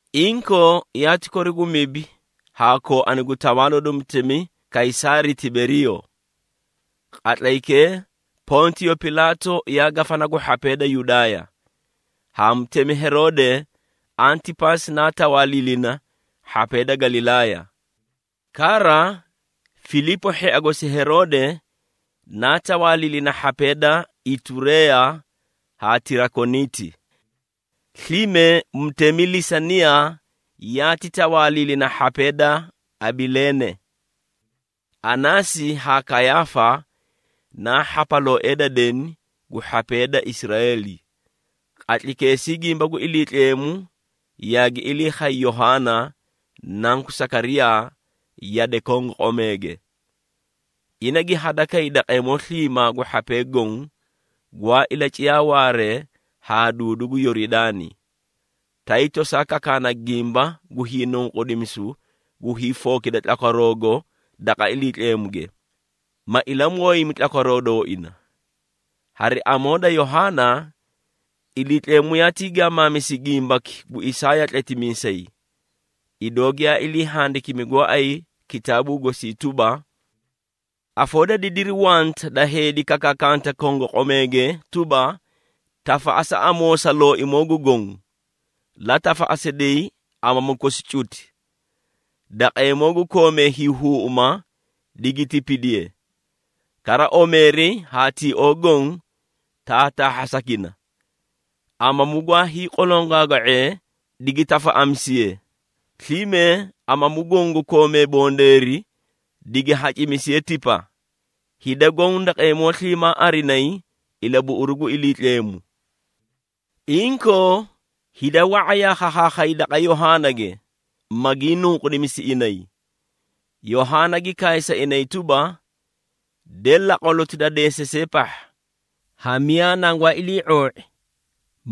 Inkoo, yaati kori gu mibi haa kooani gu tawaaloo da mutemi Kaysaari Tiberiiyo. Qatlaykee Pontiyo Pilaatu yaa gafana gu hhapee da Yudaaya, haa mutemi Heroode Antipaasi naa tawaaliilina hhapee da Galilaaya. Kara, Filiipo hhia gosi Heroode naa tawaaliilina hhapee da Itureeya haa Tirakoniiti. Slime mutemi Lisaniiya yaati tawaaliilina hhapee da Abileene. Anaasi haa Kayaafa naa hhapalooee da deni gu hhapee da Israeeli. Qatlaykeesii gimba gu Iliitleemu yaagi ilii khay Yohaana, nanku Sakariyaa yade kongoqomeege. Ina gi hadakay daqeemoo sliimaa gu hhapee goõ, gwaa ilaciyaa waaree haa duudu gu Yoridaani, tay tosaa kakaana gimba gu hiinunqudimisu gu hiifookida tlakwaroogo daqa Iliitleemuge, ma ilamooyimi tlakwaroo dooina. Hari amoo da Yohaana, Iliitleemu yaatii gaamaamisi gimbaki gu Isaaya tletimiisay, idoo giyaa ilii handikimi gooay kitaabuu gosii tuba, “Afoo da didiri wanta da heedi kakaakanta kongoqomeege tuba, ‘Tafaꞌasa amoo sa Looimoo gu Goõ, la tafaꞌasiday amamu kosi cuti! Daqeemoo gu koomee hiihuuꞌuma, digi tipidiye, kara omeeri haa tioo goõ, taataahhasakina. Amamu gwaay qolongaaga⁄ee, digi tafaꞌamisiye, slime amamu goõ gu koomee bondeeri, digi hacimisiye tipa. Hida goõ daqeemoo sliimaa arinayi, ilabuꞌuruu gu Iliitleemu.’” Inkoo, hida wa⁄a yaa khakhaakhayay daqa Yohaanage, magii nunqudimisi inay. Yohaana gi kaay sa inay tuba, “De, laqwaloti da deesasee pahha! Ha miyaa nangwaa ilii⁄oo⁄i,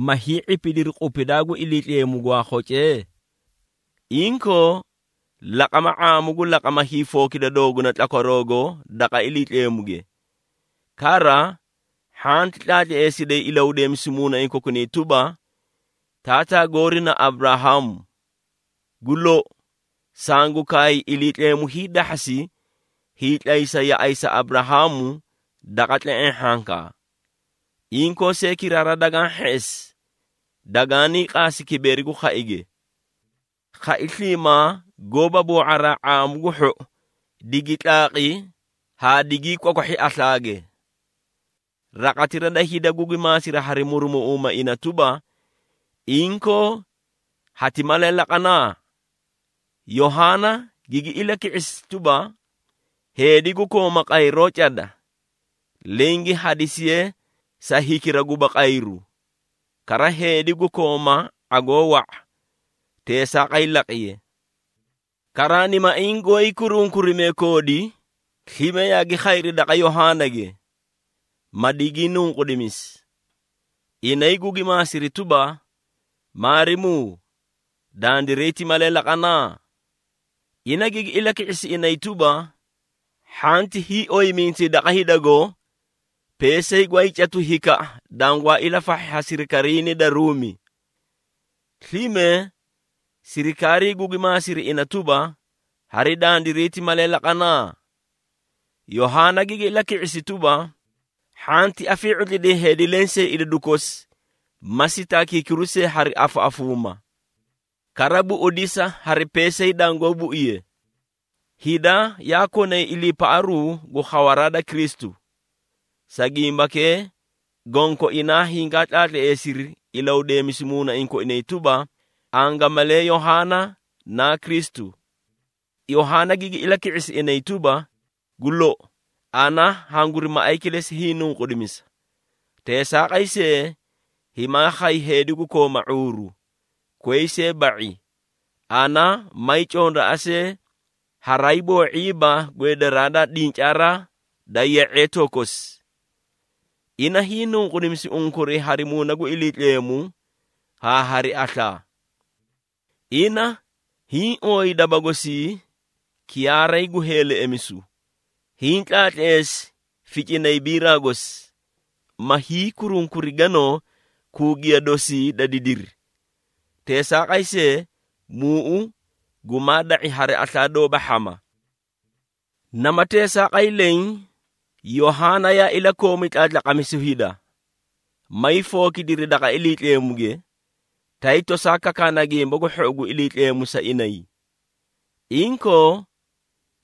ma hii⁄ipidiri qupidaa gu Iliitleemu, gwaa khocee? Inkoo, laqama ⁄aamu gu laqama hiifookida dooguna tlakwaroogo daqa Iliitleemuge. Kara, hhanti tlaatleesiday ilahudeemisu muunaiĩ kokunay tuba, ‘Taataa goori na Aburahaamu!’ Gu lou, sangu kaay Iliitleemu hiidahhasi hiitlaysa yaꞌay sa Aburahaamu daqa tle⁄eẽ hhankaa. Inkoo see kiraara dagaã hheꞌesi, daganii qaasi kibeeri gu khaige! Khai sliimaa gooba boo⁄araa ⁄aamu gu hhou, digi tlaaqi haa digii kwakwahhi aslaage!” Raqatira da hida gugi maasidi hari murumuꞌuumaa ina tuba, “Inkoo, hati malee laqana?” Yohaana gigi ilaki⁄isi tuba, “Heedi gu kooma qayroo cada, leẽ gi hadisiye sa hikira guba qayru. Kara heedi gu kooma ⁄agoo wa⁄a, teesaaqay laqiye.” Karaanimaiĩ goóyii kurunkurimee koodi slime yaagi khayri daqa Yohaanage, ma digii nunqudimisi. Inay gugi maasiri tuba, “Maarimuu, dandiray ti malee laqana?” Ina gigi ilaki⁄isi inay tuba, “Hhanti hiioyimintayi daqa hidago peesay gwaay catu hikaꞌa dangwaa ilafahhi ha sirikariinii da Ruumi.” Slime sirikaarii gugi maasiri ina tuba, “Hari dandiray ti malee laqana?” Yohaana gigi ilaki⁄isi tuba, “Hhanti afii⁄utlida heedi lensee idadu kosi ma sitaakiikiru see hari afaꞌafuumaa! Kara buꞌudisa hari peesay dangoó buiye.” Hida yaa konay iliipaꞌaru gu khawaraa da Kristu. Sa gimbakee, gonkoinaa hingaa tlaatleesiri ilahudeemisu muunaiĩ koinay tuba, angamalee Yohaana naa Kristu. Yohaana gigi ilaki⁄isi inay tuba, “Gu lou, ana hanguri maꞌay kilesi hiinunqudimisa. Teesaaqay see, himaa khay heedi gu kooma ⁄uuru, koyi see ba⁄i, ana may condoa see haraay boo⁄iiba gweedaraa da dincaaraa da ye⁄eetoo kosi! Ina hiinunqudimisi unkuray hari Muuna gu Iliitleemu haa hari aslaa. Ina hiĩ ooyi daba gosii kiyaaray gu heeleꞌemisu, hiĩ tlaatleesi ficinay biraa gosi, ma hiikurunkuri ganoo kuugiya dosii da didiri. Teesaaqay see, muuꞌu gumaa da⁄i hari aslaa doóba hhama!” Nama teesaaqay leẽ, Yohaana yaa ilakoomi tlaatlaqamisu hida, maay fookidiri daqa Iliitleemuge, tay tosaa kakaana Gimba gu Hhou gu Iliitleemu sa inay. Inkoo,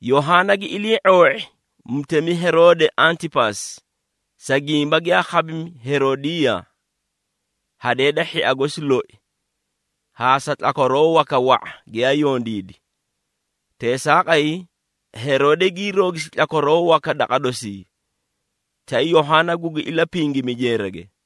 Yohaana gi ilii⁄oo⁄i mutemi Heroode Antipaasi, sa gimba giyaa khabimi Heroodiiya, hadee da hhia gosi loi, haa sa tlakwaroo waka wa⁄a giyaa yondiidi. Teesaaqay Heroode gii roogisi tlakwaroo waka daqa dosii, tay Yohaana gugi ilapingimi jeerage.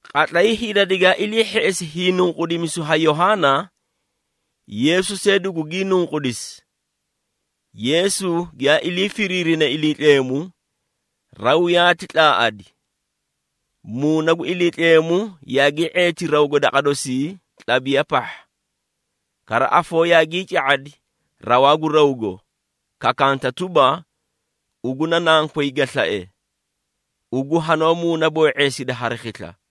Qatlay hida digaa ilii hheꞌesi hiinunqudimisu ha Yohaana, Yeesu see dugugii nunqudisi. Yeesu giyaa ilii firiirine Iliitleemu, raw yaati tlaaꞌadi. Muuna gu Iliitleemu yaagii ⁄eeti rawgo daqa dosii, tlabiya pahha. Kara afoo yaagii ca⁄adi rawaa gu rawgo, kakanta tuba, “Ugu na Nankoy ga slae! Ugu hanoó muunaboo⁄eesida hari khisla!”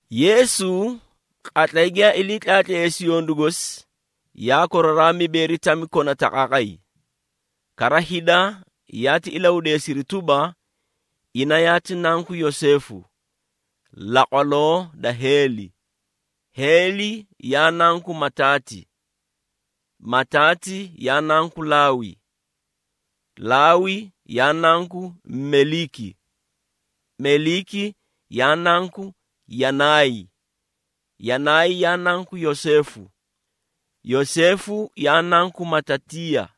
Yeesu qatlay giyaa ilii tlaatleesi yondu gosi, yaa koraraa mibeeri tami kona taqaaqay. Kara hida yaati ilahudeesiri tuba, ina yaati nanku Yoseefu, laqwaloo da Heeli. Heeli, yaa nanku Mataati. Mataati, yaa nanku Laawi. Laawi, yaa nanku Meliiki. Meliiki, yaa nanku Yanaay. Yanaay, yaa nanku Yoseefu. Yoseefu, yaa nanku Matatiiya.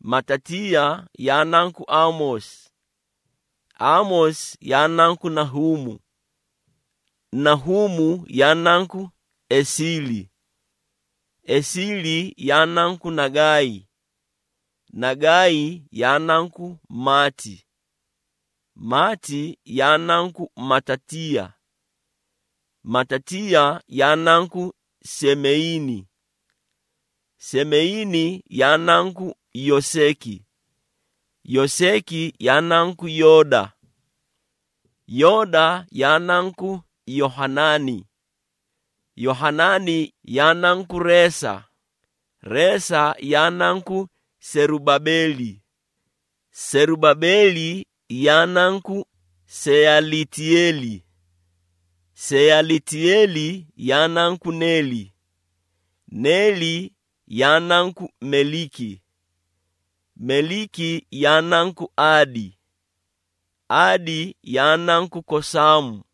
Matatiiya, yaa nanku Aamoosi. Aamoosi, yaa nanku Nahuumu. Nahuumu, yaa nanku Esiili. Esiili, yaa nanku Nagaay. Nagaay, yaa nanku Maati. Maati, yaa nanku Matatiiya. Matatiiya, yaa nanku Semeyiini. Semeyiini, yaa nanku Yoseeki. Yoseeki, yaa nanku Yooda. Yooda, yaa nanku Yohanaani. Yohanaani, yaa nanku Reesa. Reesa, yaa nanku Serubabeeli. Serubabeeli ya nanku Seyalitiyeeli Seyalitiyeeli, yaa nanku Neeri. Neeri, yaa nanku Meliiki. Meliiki, yaa nanku Aadi. Aadi, yaa nanku Kosaamu.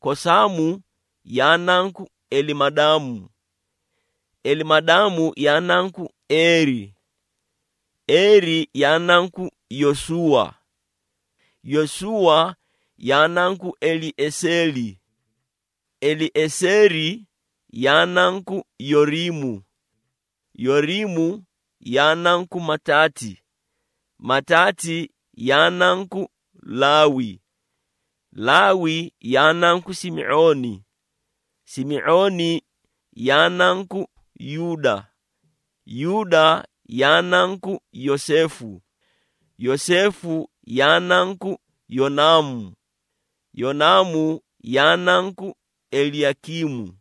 Kosaamu, yaa nanku Elimadaamu. Elimadaamu, yaa nanku Eeri. Eeri, yaa nanku Yosuuwa. Yosuuwa, yaa nanku Elieseeri. Elieseeri, yaa nanku Yoriimu. Yoriimu, yaa nanku Mataati. Mataati, yaa nanku Laawi. Laawi, yaa nanku Simi⁄ooni. Simi⁄ooni, yaa nanku Yuuda. Yuuda, yaa nanku Yoseefu. Yoseefu, yaa nanku Yonaamu. Yonaamu, yaa nanku Eliyakiimu.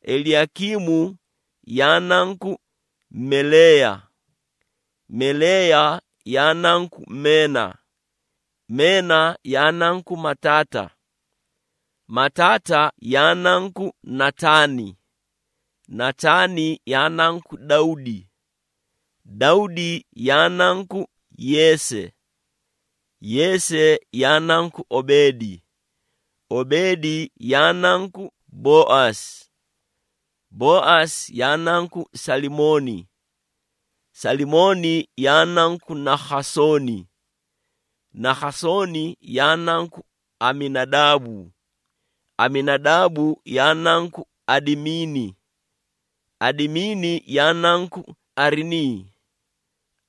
Eliyakiimu, yaa nanku Meleeya. Meleeya, yaa nanku Meena. Meena, yaa nanku Mataata. Mataata, yaa nanku Nataani. Nataani, yaa nanku Dawdi. Dawdi, yaa nanku Yeese. Yeese, yaa nanku Obeedi. Obeedi, yaa nanku Boaasi. Boaasi, yaa nanku Salimooni. Salimooni, yaa nanku Nakhasooni. Nakhasooni, yaa nanku Aminadaabu. Aminadaabu, yaa nanku Adimiini. Adimiini, yaa nanku Arinii.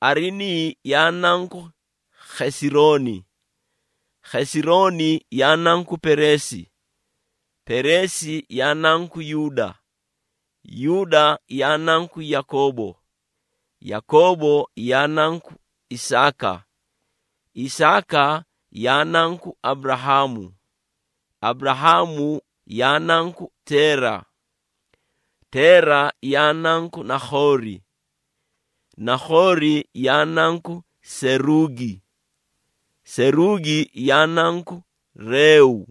Arinii, yaa nanku Khesirooni. Khesirooni, yaa nanku Pereesi. Pereesi, yaa nanku Yuuda. Yuuda, yaa nanku Yakoobo. Yakoobo, yaa nanku Isaaka. Isaaka, yaa nanku Aburahaamu. Aburahaamu, yaa nanku Teera. Teera, yaa nanku Nakhoori. Nakhoori, yaa nanku Seruugi. Seruugi, yaa nanku Reeu.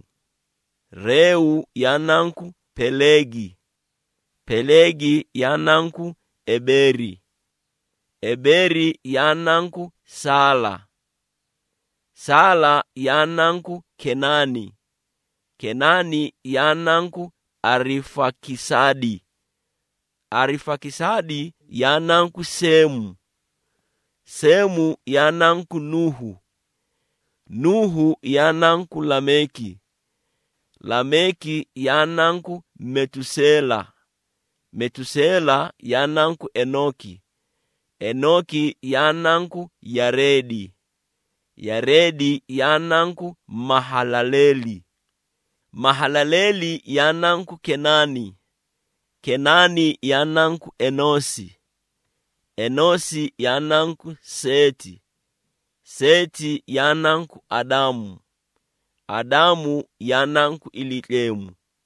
Reeu, yaa nanku Peleegi. Peleegi, yaa nanku Ebeeri. Ebeeri, yaa nanku Saala. Saala, yaa nanku Kenaani. Kenaani, yaa nanku Arifakisaadi. Arifakisaadi, yaa nanku Seemu. Seemu, yaa nanku Nuuhu. Nuuhu, yaa nanku Lameeki. Lameeki, yaa nanku Metuseela. Metuseela, yaa nanku Enooki. Enooki, yaa nanku Yareedi. Yareedi, yaa nanku Mahalaleeli. Mahalaleeli, yaa nanku Kenaani. Kenaani, yaa nanku Enoosi. Enoosi, yaa nanku Seeti. Seeti, yaa nanku Adaamu. Adaamu, yaa nanku Iliitleemu.